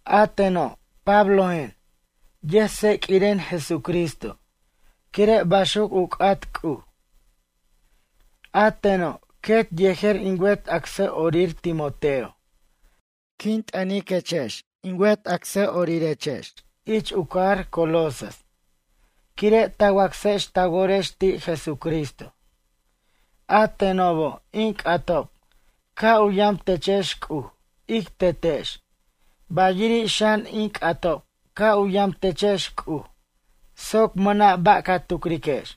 A teno' Pablojen, yʌjtseq'uiren Jesucristo quire' baxuc u c'at C'uj. A teno' quet yejer in wet acsʌ'orir Timoteo quin t'ʌniquechex in wet acsʌ'orirex ich u cajar Colosas quire' ta wacsex ta worex ti' Jesucristo. A tenobo' in c'atob ca' u yam techex C'uj, ic Tetex, bayiri' xan in c'atob ca' u yam techex C'uj soc mʌna' ba' ca tucriquex.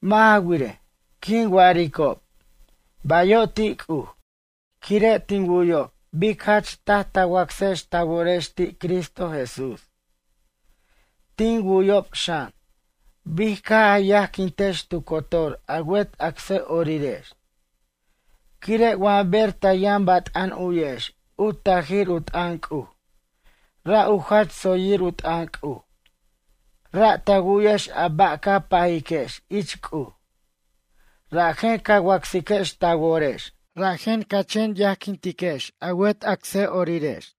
Mʌ' ja wirej, quin wa'aricob “Bayo' ti' C'uj”, quire' tin wu'yob bic jach taj ta wacsex ta worex ti' Cristo Jesús. Tin wu'yob xan, bic caj a yajquintex tu cotor a wet acsʌ'orirex. Quire' wa ber ta yʌn bat'an u'yex u tajir u t'ʌn C'uj, ra' u jach tsoyir u t'ʌn C'uj, ra' ta wu'yex a ba' ca pajiquex ich C'uj, rajen ca wacsiquex ta worex, rajen ca chen yajquintiquex a wet acsʌ'orirex.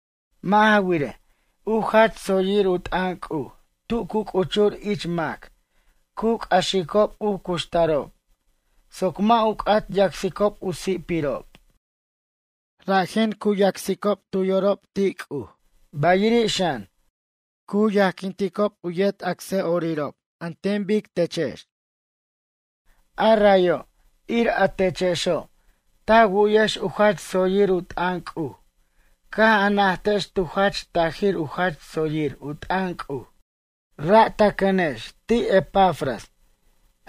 Mʌ' ja wirej, u jach tsoyir u t'ʌn C'uj tu cu c'uchur ich mac cu c'axicob u cuxtarob soc mʌ' u c'at yacsicob u si'pirob. Rajen cu yacsicob tu yorob ti' C'uj, bayiri' xan, cu yajquinticob u yet acsʌ'orirob an ten bic techex. A rayo' ir a techexo' ta wu'yex u jach tsoyir u t'ʌn C'uj caj a najtex tu jach tajir u jach tsoyir u t'ʌn C'uj. Ra' ta cʌnex ti' Epafras,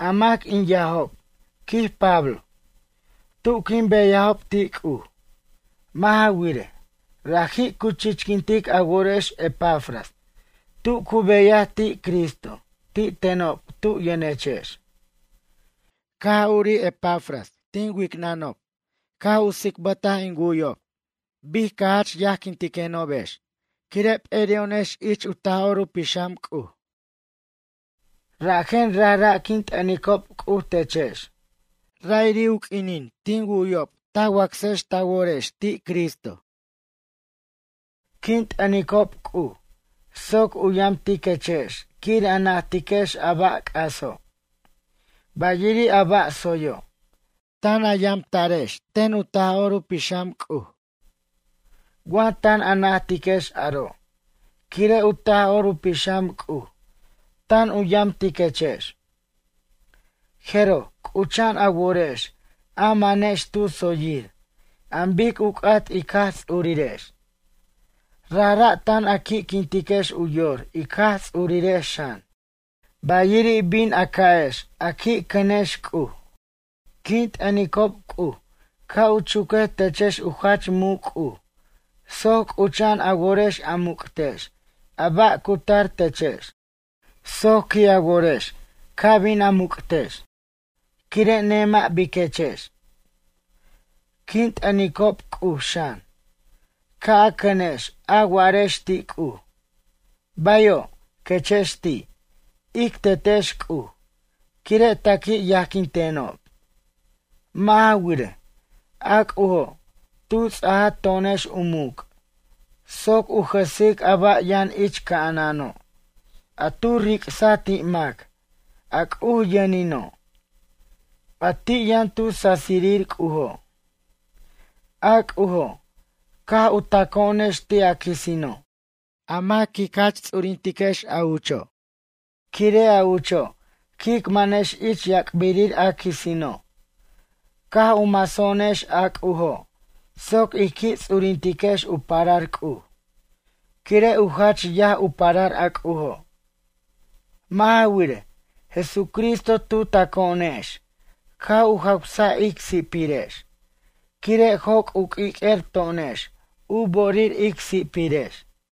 a mac in yajob, quij Pablo, tu quin beyajob ti' C'uj. Mʌ' ja wirej, raji' cu chichiquintic a worex Epafras tu cu beyaj ti' Cristo ti' tenob tu yʌnechex. Caj urij Epafras tin wicnʌnob caj u tsicbataj in wu'yob bic ca jach yajquintiquenobex, quire' p'eri'o'onex ich u Taj'or u Pixam C'uj. Rajen rajra' quin t'ʌnicob C'uj techex, ra'iri' q'uinin tin wu'yob ta wacsex ta worex ti' Cristo. Quin t'ʌnicob C'uj soc u yamtiquechex quir a najtiquex a ba' c'aso', bayiri' a ba' tsoyo', tan a yamta'rex ten u Taj'or u Pixam C'uj. Wa tan a najtiquex aro' quire' u Taj'or u Pixam C'uj tan u yamtiquechex, jeroj c'ucha'an a worex a manex tu tsoyir an bic u c'at ic Jaj Ts'urirex, rajra' tan a qui'quintiquex u yor ic Jaj Ts'urirex xan. Bayiri' bin a ca'ex a qui' cʌnex C'uj. Quin t'ʌnicob C'uj ca' u chuquej techex u jach muc' C'uj soc c'ucha'an a worex a muc'tex a ba' cu tar techex. Soc qui' a worex ca bin a muc'tex quire' nemʌ' biquechex. Quin t'ʌnicob C'uj xan, ca' a cʌnex a wa'arex ti' C'uj: “Bayo', quechex ti', ic Tetex C'uj, quire' ta qui' yajquintenob.” Mʌ' ja wirej, a C'ujo' tu ts'aja to'onex u muc' soc u jʌsic a ba' yʌn ich ca'anano' a tu ric'saj ti' mac a C'uj yʌnino', a ti' yʌn tu sasirir C'ujo'. A C'ujo' caj u taco'onex ti' a quisino', a mac ic jach ts'urintiquex a ucho'. Quire' a ucho' quic manex ic yac'birir a quisino'. Caj u maso'onex a C'ujo' soc ij qui' ts'urintiquex u parar C'uj, quire' u jach yaj u parar a C'ujo'. Mʌ' ja wirej, Jesucristo tu taco'onex caj u jawsaj ic si'pirex quire' joc' u q'uiq'uer to'onex, u bo'orir ic si'pirex.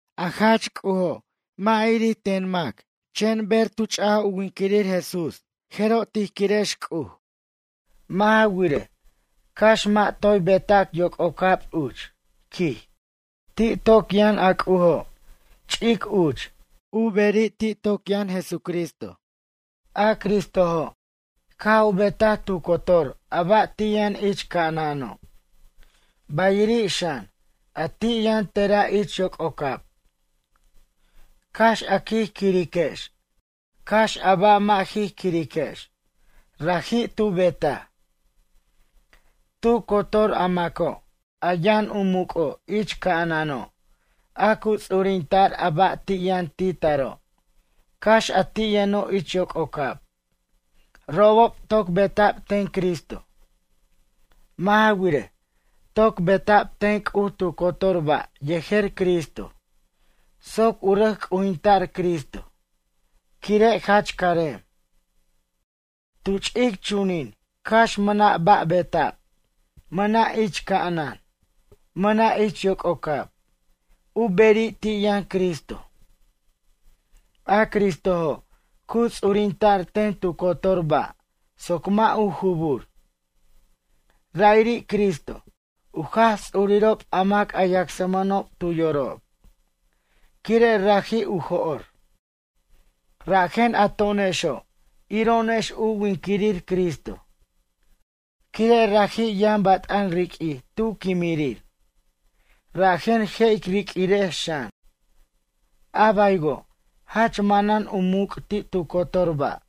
A jach C'ujo mʌ' irir ten wa mac, chen ber tu ch'aj u winquirir Jesús, jeroj tij quirex C'uj. Mʌ' ja wirej, cax mʌ' toy beta'c yoc'ocab uch, quij, ti' toc yʌn a C'ujo' ch'ic uch, u beri' ti' toc yʌn Jesucristo. A Cristojo' caj u betaj tu cotor a ba' ti' yʌn ich ca'anano', bayiri' xan, a ti' yʌn tera' ich yoc'ocab. Cax a quij quiriquex, cax a ba' mʌ' jij quirex, raji' tu betaj. Tu cotor a maco' a yʌn u muc'o' ich ca'anano' a cu ts'urinta'r a ba' ti' yʌn ti' taro' cax a ti' yʌnob ich yoc'ocab, robob toc beta'b ten Cristo. Mʌ' ja wirej, toc beta'b ten C'uj tu cotor ba' yejer Cristo soc u rʌc c'ujinta'r Cristo quire' jach carem. Tu ch'ic chunin, cax mʌna' ba' beta'b, mʌna' ich ca'anan, mʌna' ich yoc'ocab, u beri' ti' yʌn Cristo. A Cristojo' cu ts'urinta'r ten tu cotor ba' soc mʌ' u jubur. Ra'iri' Cristo u Jaj Ts'urirob a mac a yacsmʌnob tu yorob, quire' raji' u jo'r, rajen a to'onexo' iro'onex u winquirir Cristo. Quire' raji' yʌn bat'an riq'uij tu quimirir rajen je' ic riq'uirex xan, a baywo', jach manan u muc' ti' tu cotor ba',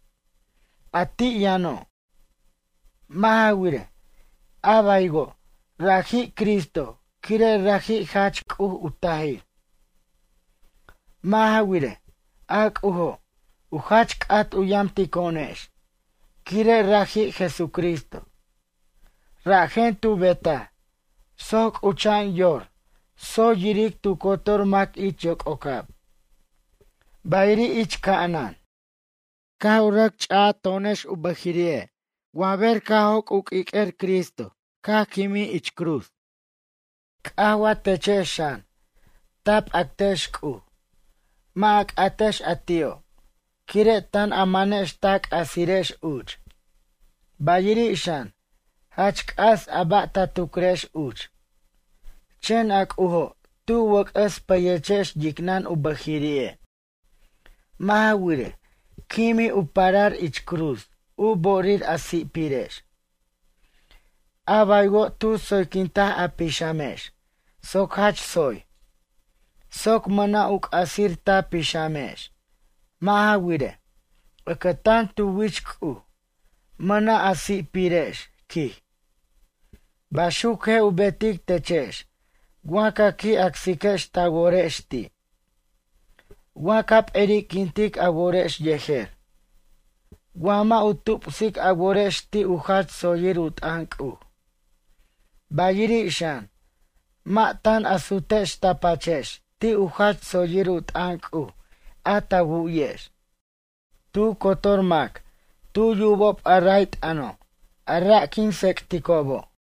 a ti' yʌno'. Mʌ' ja wirej, a baywo', raji' Cristo quire' raji' jach C'uj u tajir. Mʌ' ja wirej, a C'ujo' u jach c'at u yamtico'onex quire' raji' Jesucristo. Rajen tu betaj soc c'ucha'an yor tsoy yiric tu cotor mac ich yoc'ocab, bayiri' ich ca'anan. Caj rʌc ch'ato'onex u bʌjiri'e' wa ber caj joc' u q'ui'quer Cristo caj quimij ich cruz. C'aj wa techex xan, ta p'actex C'uj, mʌ' a c'atex a ti'o' quire' tan a manex ta c'asirex uch. Bayiri' xan, jach c'as a ba' ta tucrex uch. Chen a C'ujo' tu wʌc'ʌs payechex yicnʌn u bʌjiri'e'. Mʌ' ja wirej, quimij u parar ich cruz u bo'orir a si'pirex. A baywo' tu tsoyquintaj a pixamex soc jach tsoy, soc mʌna' u c'asir ta pixamex. Mʌ' ja wirej, ʌcʌtan tu wich C'uj, mʌna' a si'pirex, quij. Baxuc je' u betic techex wa ca qui' acsiquex ta worex ti', wa ca p'eri'quintic a worex yejer, wa mʌ' u tupsic a worex ti' u jach tsoyir u t'ʌn C'uj. Bayiri' xan, mʌ' tan a sutex ta pachex ti' u jach tsoyir u t'ʌn C'uj a ta wu'yex. Tu cotor mac tu yubob a ray t'ʌno', a ra' quin tsec'ticobo'.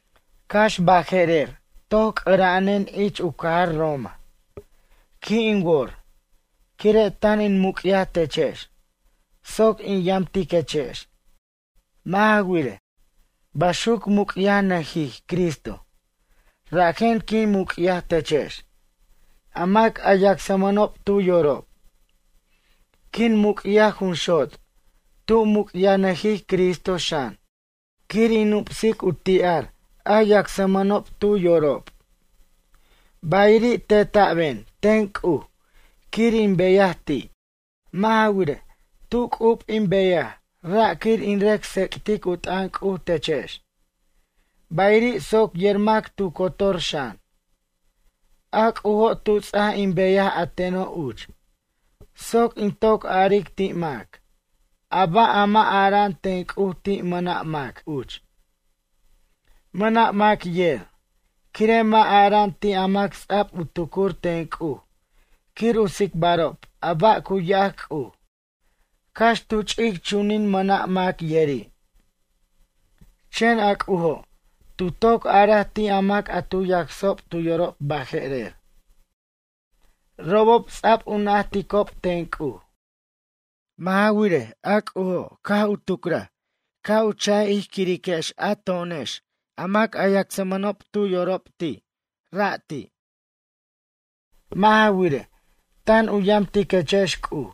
Cax baje'rer toc c'ʌra'anen ich u cajar Roma, qui' in wor, quire' tan in muc'yaj techex soc in yamtiquechex. Mʌ' ja wirej, baxuc muc'yajnʌjij Cristo, rajen quin muc'yaj techex, a mac a yacsmʌnob tu yorob. Quin muc'yaj jun xot' tu muc'yajnʌjij Cristo xan quir in nupsic u ti'ar a yacsmʌnob tu yorob. Bayiri' teta'ben ten C'uj quir in beyaj ti'. Mʌ' ja wirej, tu c'ub in beyaj ra' quir in rʌc tsec'tic u t'ʌn C'uj techex, bayiri' soc yer mac tu cotor xan. A C'ujo' tu ts'aj in beyaj a teno' uch, soc in toc aric ti' mac, a ba' a mʌ' ara'an ten C'uj ti' mʌna' mac uch. Mʌna' mac yer, quire' mʌ' ara'an ti' a mac ts'a'b u tucur ten C'uj quir u tsicbarob a ba' cu yac C'uj, cax tu ch'ic chunin mʌna' mac yeri'. Chen a C'ujo' tu toc araj ti' a mac a tu yacsob tu yorob baje'rer. Robob ts'ab u najticob ten C'uj. Mʌ' ja wirej, a C'ujo' caj u tucraj ca' u cha'bʌr ij querex, a to'onex a mac a yacsmʌnob tu yorob ti' rati'. Mʌ' ja wirej, tan u yamtiquechex C'uj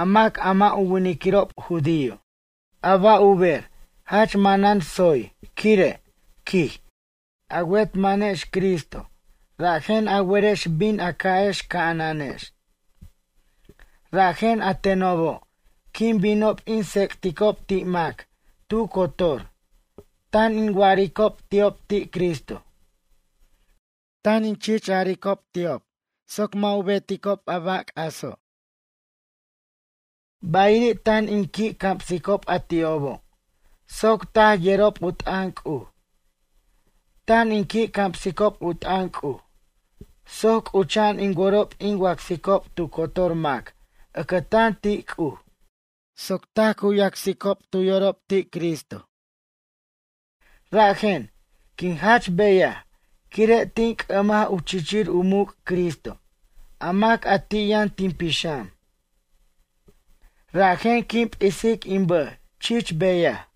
a mac a mʌ' u winiquirob judío. A ba' u ber jach manan tsoy quire', quij, a wet manex Cristo rajen a werex bin a ca'ex ca'ananex. Rajen a tenobo' quin binob in tsec'ticob ti' mac tu cotor, tan in wa'aricob ti'ob ti' Cristo. Tan in chich aricob ti'ob soc mʌ' u betob a ba' c'aso'. Bayiri' tan in qui' camsicob a ti'obo' soc taj yerob u t'ʌn C'uj. Tan in qui' camsicob u t'ʌn C'uj soc c'ucha'an in worob in wacsicob tu cotor mac ʌcʌtan ti' C'uj soc taj cu yacsicob tu yorob ti' Cristo. Rajen, quin jach beyaj quire' tin c'ʌmaj u chichir u muc' Cristo a mac a ti' yʌn tin pixam. Rajen quin p'isic in bʌj chich beyaj.